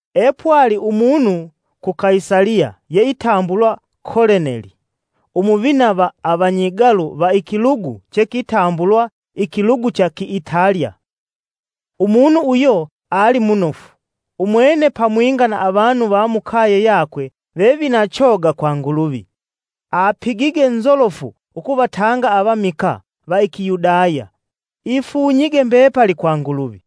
Epwali umunu ku Kaisaliya yeitambulwa Koleneli, Umuvina va Avanyigalu va ikilugu chekitambulwa, “Ikilugu cha Kiitalya.” Umunu uyo ali munofu, umwene pamwinga na avanu va mukaye yakwe vevina choga kwa Nguluvi. Apigige nzolofu ukuvatanga avamikaa va Ikiyudya ifunyige mbepali kwa Nguluvi.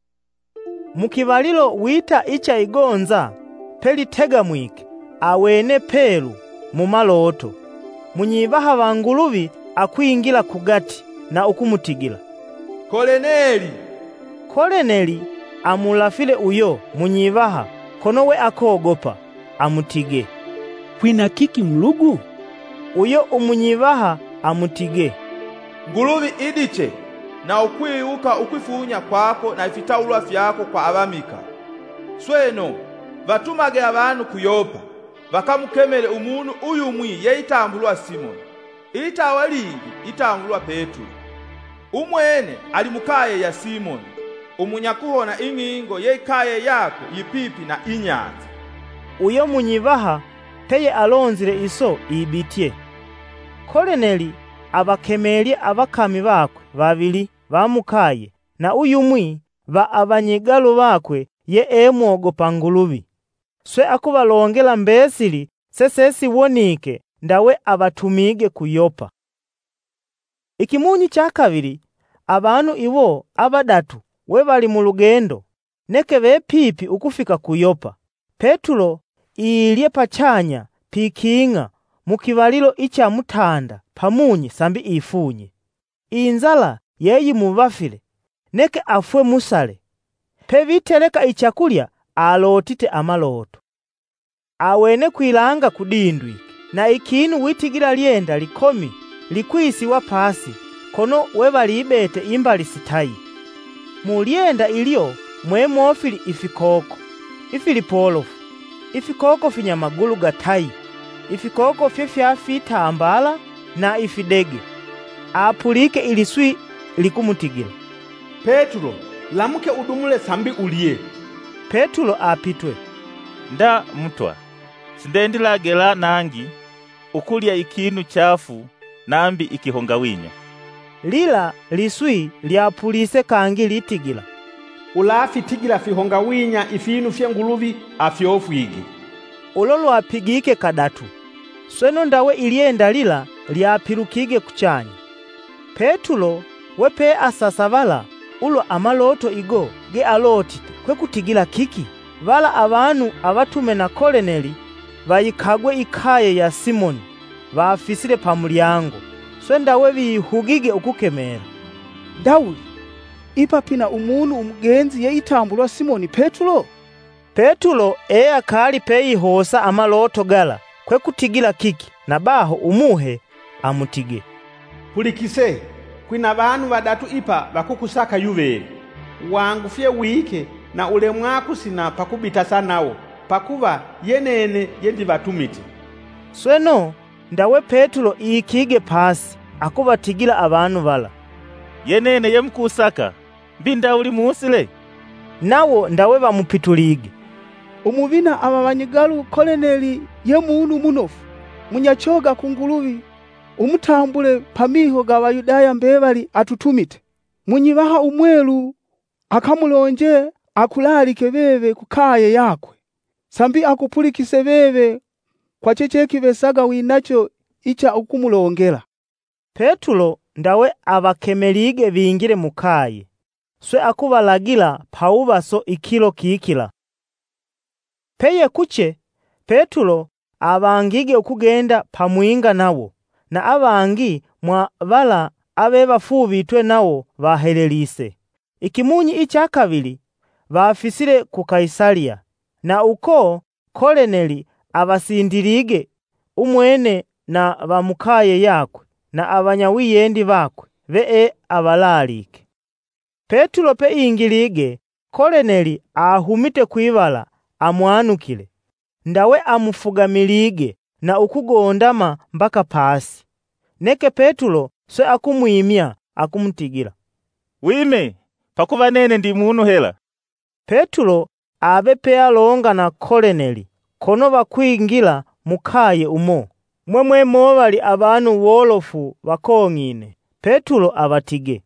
Mu kivalilo wita icha igonza pelitegamwike, awene pelu mumaloto munyivaha va Nguluvi akwingila kugati na ukumutigila, “Koleneli!” Koleneli amulafile uyo munyivaha kono we akogopa, amutigee, “Kwina kiki Mulugu?” Uyo umunyivaha amutigee, “Nguluvi idiche na ukwiwuka ukwifunya kwako na ifitawulwa fyako kwa avamikaa. Sweno, vatumage avanu ku Yopa vakamukemele umunu uyumwi yeitambulwa Simoni, ilitawa lingi itambulwa Petulo. Umwene ali mukaye ya Simoni umunyakuhona ing'ingo yeikaye yakwe yipipi na ibahali.” Uyo munyivaha peyealonzile iso ibitye, Koleneli avakemelye avakami vakwe vavili va mukaye na uyumwi va avanyigalu vakwe yee mwogopa Nguluvi, swe akuvalongela mbesili sesesiwonike, ndawe avatumige ku Yopa. Ikimunyi cha kavili, avanu iwo avadatu we vali mulugendo, neke vepipi ukufika ku Yopa, Petulo iilyee pachanya piking'a mukivalilo icha mutanda pamunyi sambi ifunye. Inzala yeyimuvafile, neke afwe musale. Peviteleka ichakulya, alotite amaloto. Awene kwilanga kudindwike na ikinu witigila lyenda likomi likwisiwa pasi kono wevalibete imbali sitayi. Mulyenda ilyo mwemofili ifikoko ifilipolofu: ifikoko finyamagulu gatayi, ifikoko fyefyafitambala na ifidege. Apulike iliswi likumutigila, “Petulo lamuke udumule sambi ulye!” Petulo apitwe, “Nda, Mutwa; sindendilagela nangi ukulya ikinu chaafu nambi ikihongawinya.” Lila liswi lyapulise kangi litigila: “Ulafitigila fihongawinya ifinu fye Nguluvi afyofwige!” Ulo lwapigike kadatu, sweno ndawe ilyenda lila lyapilukige kuchanya. Petulo we peasasavala ulwa amaloto igo gealotite kwekutigila kiki vala avanu avatume na Koleneli, vayikagwe ikaye ya Simoni, vafisile pamulyango, swe ndawe vihugige ukukemela: “Ndawuli ipa pina umunu umugenzi yeitambulwa Simoni Petulo?” Petulo eakali peihosa amaloto gala kwekutigila kiki, na baho Umuhe amutige, “Pulikise! Kwina vanu vadatu ipa vakukusaka yuveve. Wangufye wike na ulemwa kusina pakubitasa nawo, pakuva ye nene yendivatumite.” Sweno, ndawe Petulo ikige pasi, akuvatigila avanu vala, “Ye nene yemukusaka. Mbi ndawuli musile?” Nawo ndawe vamupitulige, “Umuvina va avanyigalu Koleneli ye munu munofu, munyachoga kwa Nguluvi umutambule pamiho ga Avayudaya mbevali atutumite. Munyivaha Umwelu akamulonje akulaalike veve kukaye yakwe, sambi akupulikise veve kwa chechekivesaga winacho icha ukumulongela.” Petulo ndawe avakemelige vingile mukaye, swe akuvalagila pawuvaso ikilo kikila. Peyekuche, Petulo avangige ukugenda pamwinga nawo na avangi mwavala avevafuuvitwe nawo vahelelise. Ikimunyi icha kavili vafisile ku Kaisaliya na uko Koleneli avasindilige Umwene na va mukaye yakwe na avanyawiyendi vakwe veeavalaalike. Petulo peingilige, Koleneli ahumite kwivala amwanukile, ndawe amufugamilige na ukugondama mbaka pasi. Neke Petulo swe akumwimya, akumutigila, “Wime, pakuva nene ndi munu hela.” Petulo ave pealonga na Koleneli kono vakwingila mukaye umo mwemwemovali avanu wolofu vakong'ine. Petulo avatige,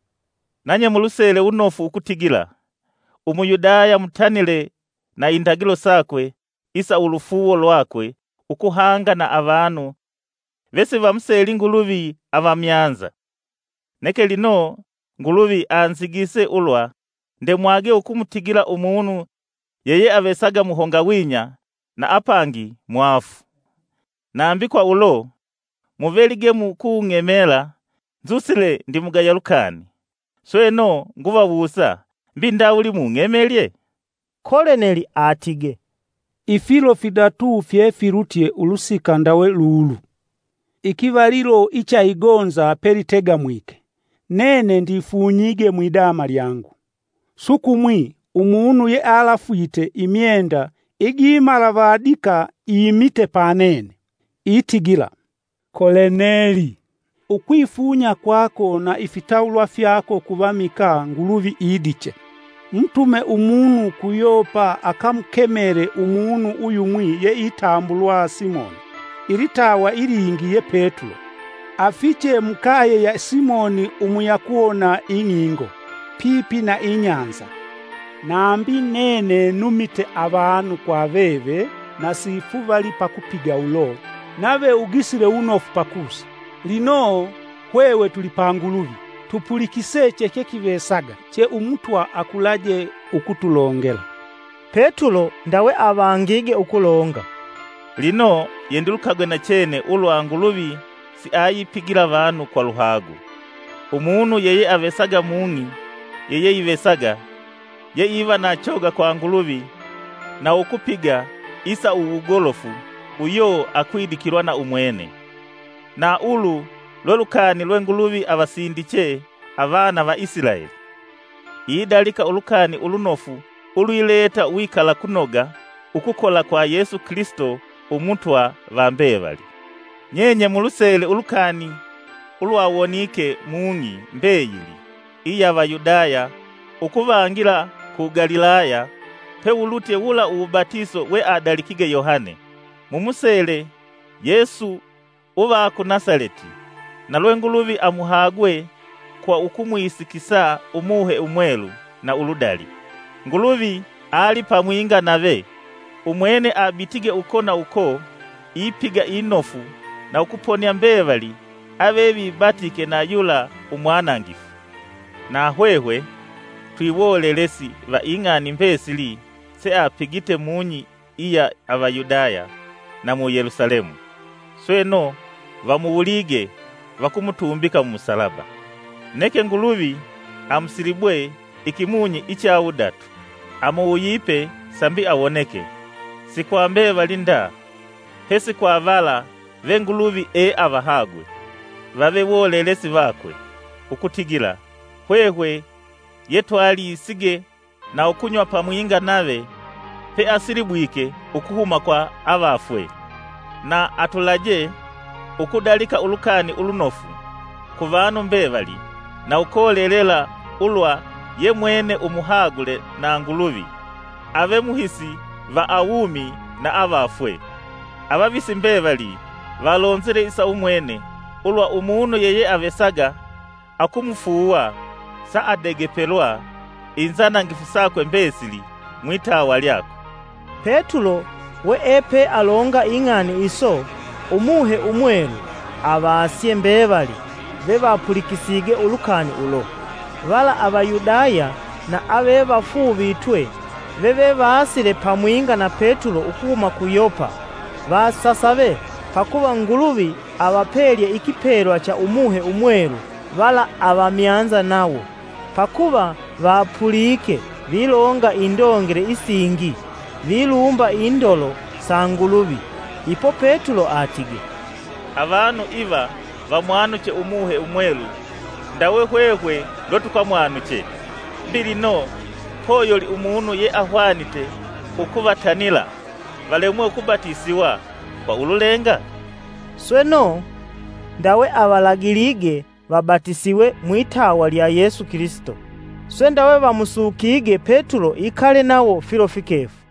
“Nanye mulusele wunofu ukutigila Umuyudaya mutanile na Indagilo sakwe isa ulufuuwo lwakwe ukuhanga na avanu vesivamuseli Nguluvi avamyanza. Neke lino Nguluvi anzigise ulwa ndemwage ukumutigila umunu yeyeavesaga muhongawinya na apangi mwaafu. Nambi kwaulo, muvelige mukung'emela nzusile ndimugaya lukani. Sweno, nguvawusa; mbi ndawuli mung'emelye?” Koleneli atige, “Ifilo fidatu fyefilutye ulusika ndawe lulu, ikivalilo icha igonza pelitegamwike, nene ndifunyige mwidama lyangu. Sukumwi, umunu yealafwite imyenda igimalavadika imite pa nene, itigila: ‘Koleneli! Ukwifunya kwako na ifitawulwa fyako kuvamikaa Nguluvi idiche. Mutume umunu ku Yopa akamukemele umunu uyumwi yeitambulwa Simoni, ilitawa ilingi ye Petulo; afiche mukaye ya Simoni umunyakuhona ing'ingo pipi na ibahali.’ Nambi nene numite avanu kwa veve na sifuvalii pakupiga ulo, nave ugisile wunofu pakusa. Lino, hwehwe tuli pa Nguluvi, tupulikise chechekivesaga che Umutwa akulaje ukutulongela.” Petulo ndawe avangige ukulonga: “Lino yendilukagwe nachene ulwa Nguluvi siayipigila avanu kwa luhagu. Umunu yeyeavesaga mung'i yeyeivesaga yeiva na choga kwa Nguluvi na ukupiga isa uwugolofu uyo akwidikilwa na umwene. Na ulu lwe lukani lwe Nguluvi avasindiche avana va Isilaeli, idalika ulukani ulunofu ulwileta uwikalakunoga ukukola kwa Yesu Kilisito Umutwa va mbevali. Nyenye mulusele ulukani ulwawonike mung'i mbeyili iya Avayudaya ukuvangila ku Galilaya pewulutye wula uwubatiso weadalikige Yohane. Mumusele Yesu uva ku Nasaleti na lwe Nguluvi amuhagwe kwa ukumwisikisa Umuhe Umwelu na uludali. Nguluvi ali pamwinga nave; umwene abitige uko na uko ipiga inofu na ukuponia mbevali avevibatike na yula umwanangifu. Na hwehwe twiwolelesi va ing'ani mbesili seapigite mung'i iya Avayudaya na mu Yelusalemu. Sweno, vamuwulige vakumutumbika mumusalaba; neke Nguluvi amusilibwe ikimunyi icha wudatu, amugisile sambi awoneke si kwa mbevali nda pesi kwa vala ve Nguluvi eavahagwe vave wolelesi vakwe, ukutigila hwehwe yetwalisige na ukunywa pamwinga nave peasilibwike ukuhuma kwa avafwe. Na atulaje ukudalika ulukani ulunofu ku vanu mbevali na ukolelela ulwa ye mwene umuhagule na Nguluvi ave muhisi va awumi na avafwe. Avavisi mbevali valonzile isa umwene ulwa umunu yeyeavesaga akumufuuwa saadegepelwa inzanangifu sakwe mbesili mwitawa lyakwe.” Petulo weepealonga ing'ani iso, Umuhe Umwelu avasye mbevali vevapulikisige ulukani ulo. Vala Avayudaya na avevafuuvitwe vevevasile pamwinga na Petulo ukuhuma ku Yopa vasasave pakuva Nguluvi avapelye ikipelwa cha Umuhe Umwelu vala avamyanza nawo; pakuva vapulike vilonga indongele isingi vilumba indolo sa Nguluvi. Ipo Petulo atige, “Avanu iva vamwanuche Umuhe Umwelu ndawe hwehwe lwetukamwanuche. Mbi, lino poyoli umunu yeahwanite ukuvatanila valemwe ukubatisiwa kwa ululenga?” Sweno, ndawe avalagile vabatisiwe mwitawa lya Yesu Kilisito. Swe ndawe vamusukige Petulo ikale nawo filo fikefu.